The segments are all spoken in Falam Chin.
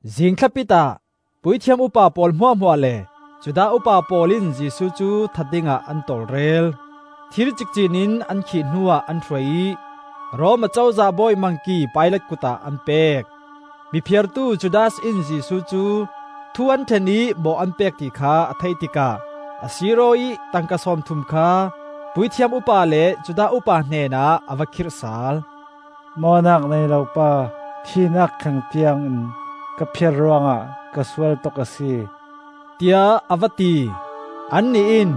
Zingthlapit ah puithiam upa pawl hmuahhmuah le Judah upa pawl in Jesuh cu that dingah an tawlrel. Thir cikcin in an khih hnuah an hruai ih Rom Acozah bawi Mangki Pilat kut ah an pek. Mi phiartu Judas in Jesuh cu thu an ṭhen ih mawh an pek ti kha a theih tikah a sir-aw ih tangka sawmthum kha puithiam upa le Judah upa hnenah a va khirh sal. “Mawhnak nei lo pa thihnak thleng tiangin ka phiar ruangah ka sual tuk a si,” tiah a va ti. Annih in,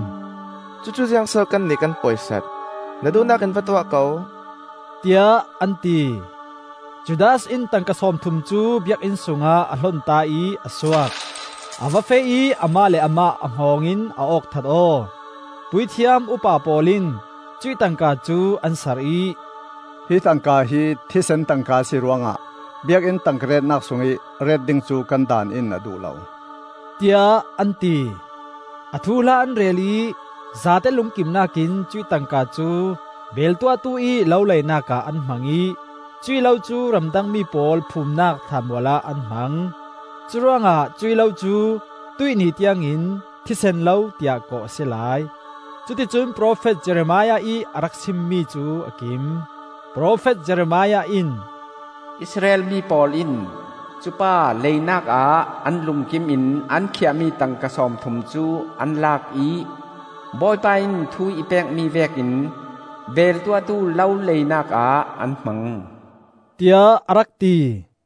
“Cucu ziangso kannih kan poisat? Na duhnak in va tuah ko,” tiah an ti. Judas in tangka sawmthum cu Biakinn sungah a hlonta ih a suak. A va feh ih amah le amah a hngawng in a awk that aw. Puithiam upa pawl in cuih tangka cu an sar ih, “Hi tangka hi thisen tangka a si ruangah biakinn tangka retnak sungih ret ding cu kan Daan in a duh lo,” tiah an ti. A thuhla an rel ih zate lungkimnak in cuih tangka cu Beel Tuahtu ih lo leinak ah an hmang ih cuih lo cu ramdangmi pawl phumnak thlaanmual ah an hmang. Curuangah cuih lo cu tuih ni tiangin, “Thisen Lo,” tiah kawh a si lai. Cuticun profet Jeremiah ih a rak simmi cu a kim. Profet Jeremiah in, “Israel mi pawl in cupa leinak ah an lungkim in an khiahmi tangka sawmthum cu an lak ih, Bawipa in thu i pekmi vekin beel tuahtu lo leinak ah an hmang,” tiah a rak ti.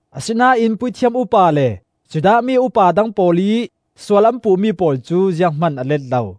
Asinain puithiam upa le Judah mi upa dang pawl ih sual an puhmi pawl cu zianghman a let lo.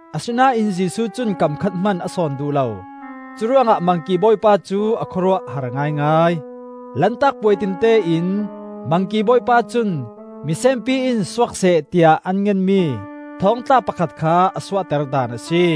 Asinain Jesuh cun kam khat hman a sawn duh lo; curuangah Mangki bawipa cu a khawruah a har ngaingai. Lantak puai tinte in Mangki bawipa cun, misenpi in suakseh tiah an ngenmi thawngtla pakhat kha a suahter daan a si.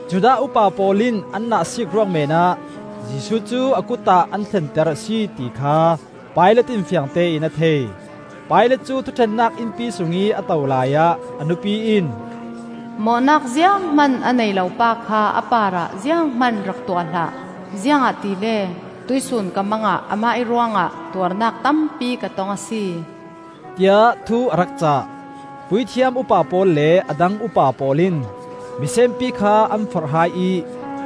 Judah upa pawl in an nahsiik ruang meenah Jesuh cu a kut ah an thlenter a si, ti kha Pilat in fiangtein a thei. Pilat cu thuṭhennak innpi sungih a to laiah a nupi in, “Mawhnak zianghman a nei lo pa kha a parah zianghman rak tuah hlah. Ziangahtile tuihsun ka mang ah amah ih ruangah tuarnak tampi ka tong a si,” tiah thu a rak cah. Puithiam upa pawl le a dang upa pawl in misenpi kha an forh hai ih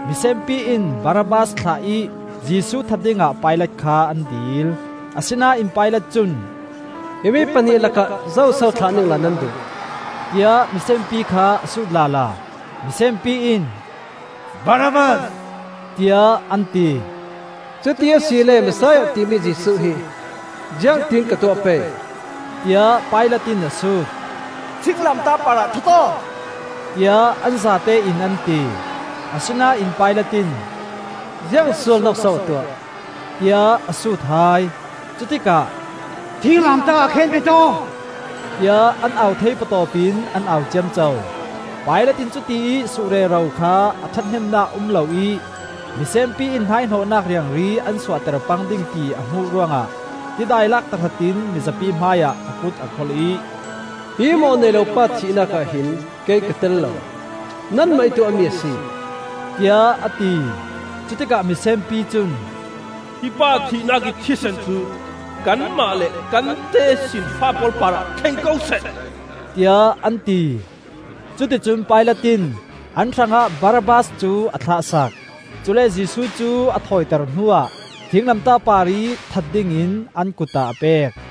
misenpi in Barabbas thlah ih Jesuh that dingah Pilat kha an dil. Asinain Pilat cun, “Himi pahnih lakah zoso thlah ningla nan duh?” tiah misenpi kha a sut lala. Misenpi in, “Barabbas,” tiah an ti. “Cuti asile Messiah timi Jesuh hi ziangtin ka tuah pei?” tiah Pilat in a sut. “Thinglamtah parah that aw!” tiah an zatein an ti. Asinain Pilat in, “Ziang sualnak so a tuah?” tiah a sut hai. Cutikah, “Thinglamtah ah khenbet aw!” tiah an au thei patawp in an au ciamco. Pilat in cutiih suh rero kha a ṭhathnemnak a um lo ih misenpi in hnaihnawhnak riangri an suakter pang ding ti a hmuh ruangah tidai lak tahratin mizapi hmaiah a kut a kholh ih, “Hi mawh nei lo pa thihnak ah hin kei ka tel lo! Nanmah ih tuahmi a si,” tiah a ti. Cutikah misenpi cun, “Hi pa thihnak ih thisen cu kanmah le kan tesinfa pawl parah thleng ko seh,” tiah an ti. Cuticun Pilat in an hrangah Barabbas cu a thlah sak; cule Jesuh cu a thawiter hnuah thinglamtah parih that dingin an kut ah a pek.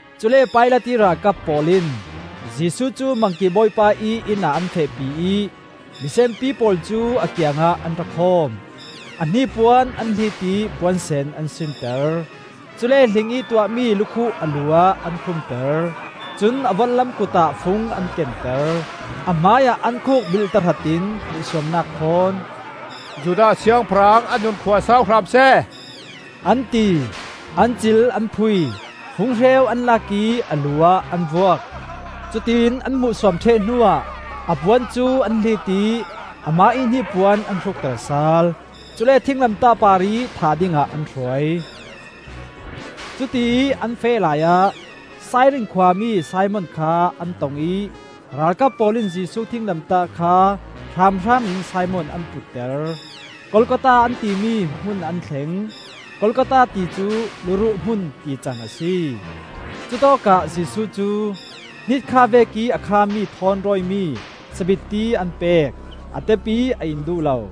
Cule Pilat ih ralkap pawl in Jesuh cu Mangki bawipa ih inn ah an fehpi ih misenpi pawl cu a kiangah an ra khawm. A hnipuan an hlit ih puansen an sinter. Cule hlingih tuahmi lukhuh a lu ah an khumter; cun a vorhlam kut ah fung an kenter. A hmaiah an khuk bilh tahrat in hmuhsuamnak thawn, “Judah Siangpahrang a nun khua sau hram seh,” an ti. An cil an phui, funghreu an lak ih a lu ah an vuak. Cutiin an hmuhsuam ṭheh hnuah a puan cu an hlit ih amah ih hnipuan an hrukter sal. Cule thinglamtah parih thah dingah an hruai. Cutiih an feh laiah Sairin khua mi Simon kha an tong ih ralkap pawl in Jesuh thinglamtah kha hramhram in Simon an putter. Golgotha an timi hmun an thleng. Golgotha ti cu, “Luruh Hmun,” tican a si. Cutawkah Jesuh cu hnitkha vekih a khami thawn rawimi sabitti an pek; a tep ih a in duh lo.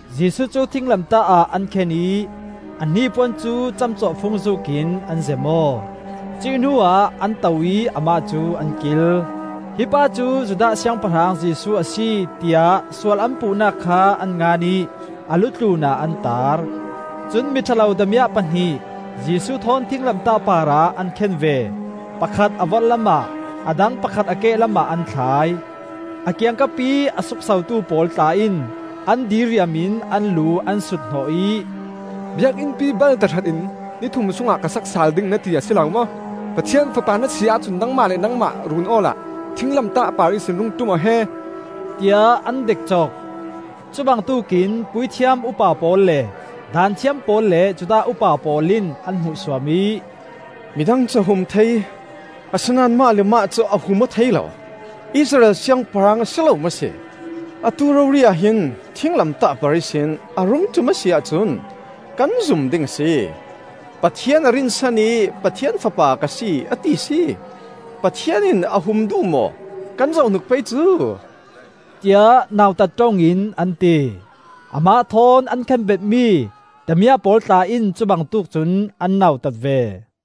Jesuh cu thinglamtah ah an khen ih a hnipuan cu camcawhfung zuukin an zem aw. Cuih hnuah an to ih amah cu an kil. “Hi pa cu Judah Siangpahrang Jesuh a si,” tiah sual an puhnak kha an ngan ih a lu tlunah an tar. Cun mi ṭha lo damiah pahnih Jesuh thawn thinglamtah parah an khen ve; pakhat a vorhlam ah, a dang pakhat a kehlam ah an thlai. A kiangkapih a suksotu pawl tla in an diriam in an lu an sut hnawh ih, “Biakinnpi bal tahratin ni thum sungah ka sak sal ding na ti a si lo maw! Pathian Fapa na si ahcun nangmah le nangmah run awla thinglamtah par ihsin rung ṭum aw he!” tiah an dekcok. Cubangtuk in puithiam upa pawl le Daanthiam pawl le Judah upa pawl in an hmuhsuam ih, midang cu a hum thei, asinain amah le amah cu a hum aw thei lo! Israel Siangpahrang a si lo maw si? Atu rori ah hin thinglamtah par ihsin a rung ṭum a si ahcun kan zum ding a si! Pathian a rinsan ih Pathian Fapa ka si a ti si! Pathian in a hum duh maw kan zoh hnik pei cu!” tiah nautat ṭong in an ti. Amah thawn an khenbetmi damiah pawl tla in cu bangtuk cun an nautat ve.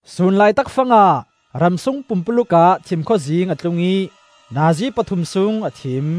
Sun laitak fangah ramsung pumpuluk ah thimkhawzing a tlung ih nazi pathum sung a thim.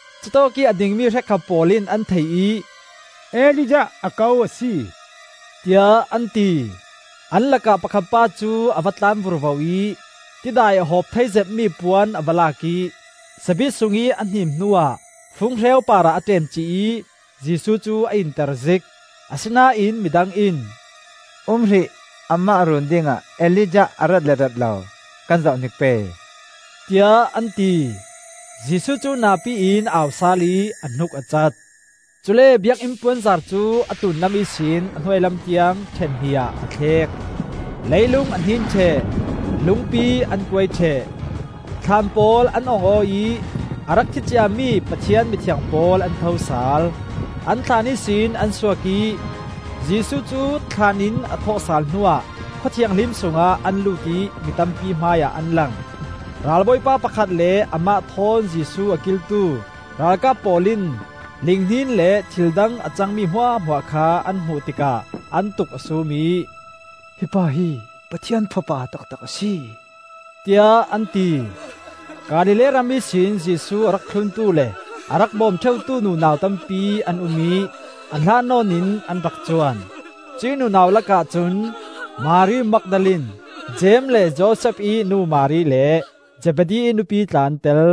Cutawkih a dingmi hrekkhat pawl in an thei ih, “Elijah a ko a si,” tiah an ti. An lakah pakhat pa cu a va tlan vurvo ih tidai a hawp thei zetmi puan a va lak ih sabit sungih a hnim hnuah funghreu parah a ṭemcih ih Jesuh cu a inter zik. Asinain midang in, “Um hrih, amah run dingah Elijah a rat le rat lo kan zohhnik pei,” tiah an ti. Jesuh cu napi in a au sal ih a hnuk a cat. Cule Biakinn puanzar cu a tlunlam ihsin a hnuailam tiang ṭhen hnih ah a tlek. Leilung a hnin ṭheh, lungpi an kuai ṭheh, thlaan pawl an ong aw ih a rak thi ciami Pathian mithiang pawl an tho sal. An thlaan ihsin an suak ih Jesuh cu thlaan in a thawhsal hnuah Khua Thianghlim sungah an lut ih mi tampi hmaiah an lang. Ral bawipa pakhat le amah thawn Jesuh a kiltu ralkap pawl in linghnin le thil dang a cangmi hmuahhmuah kha an hmuh tikah an tuk a sum ih, “Hi pa hi Pathian Fapa taktak a si,” tiah an ti. Galilee ram ihsin Jesuh a rak thluntu le a rak bawm ṭheutu nunau tampi an um ih a hlat nawn in an rak cuan. Cuih nunau lakah cun Mari Magdalene, Jeim le Josef ih nu Mari le Zebedi nupi tla an tel.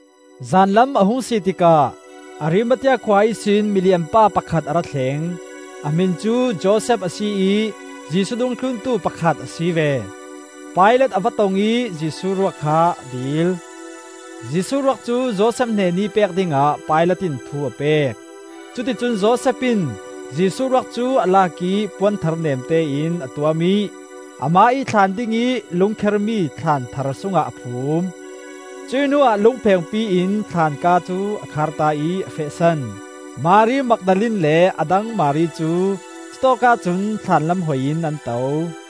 Zanlam a hung si tikah Arimathea khua ihsin milianpa pakhat a ra thleng. A hmin cu Josef a si ih Jesuh dungthluntu pakhat a si ve. Pilat a va tong ih Jesuh ruak kha a dil. Jesuh ruak cu Josef hnenih pek dingah Pilat in thu a pek. Cuticun Josef in Jesuh ruak cu a lak ih puan thar nemtein a tuam ih, amah ih thlaan dingih lungkhermi thlaan thar sungah a phum. Cuih hnuah lungphengpi in thlaan kaa cu a kharta ih a fehsan. Mari Magdalene le a dang Mari cu cutawk ahcun thlaanlam hoi in an to.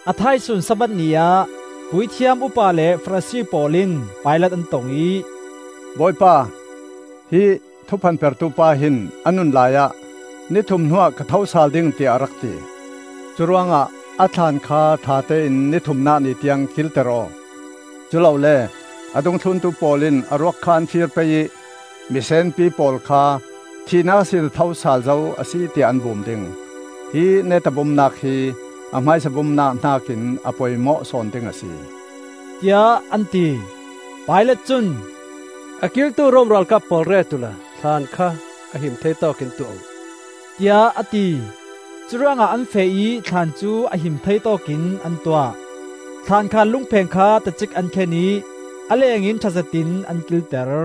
A thaisun Sabbath ni ah puithiam upa le Farasi pawl in Pilat an tong ih, “Bawipa, hi thuphanpertu pa hin a nun laiah ‘Nithum hnuah ka tho sal ding,’ tiah a rak ti. Curuangah a thlaan kha ṭhatein ni thumnak ni tiang kilter aw; culole a dungthluntu pawl in a ruak kha an fir pei ih misenpi pawl kha thihnak ihsin a tho sal zo a si, tiah an bum ding. Hi neta bumnak hi a hmaisa bumnak hnakin a poimawh sawn ding a si,” tiah an ti. Pilat cun, “A kiltu Rom ralkap pawl ret uhla thlaan kha a him thei tawkin tuah uh,” tiah a ti. Curuangah an feh ih thlaan cu a him thei tawkin an tuah; thlan khar lungpheng kha tacik an khen ih a lengin ṭha zetin an kilter.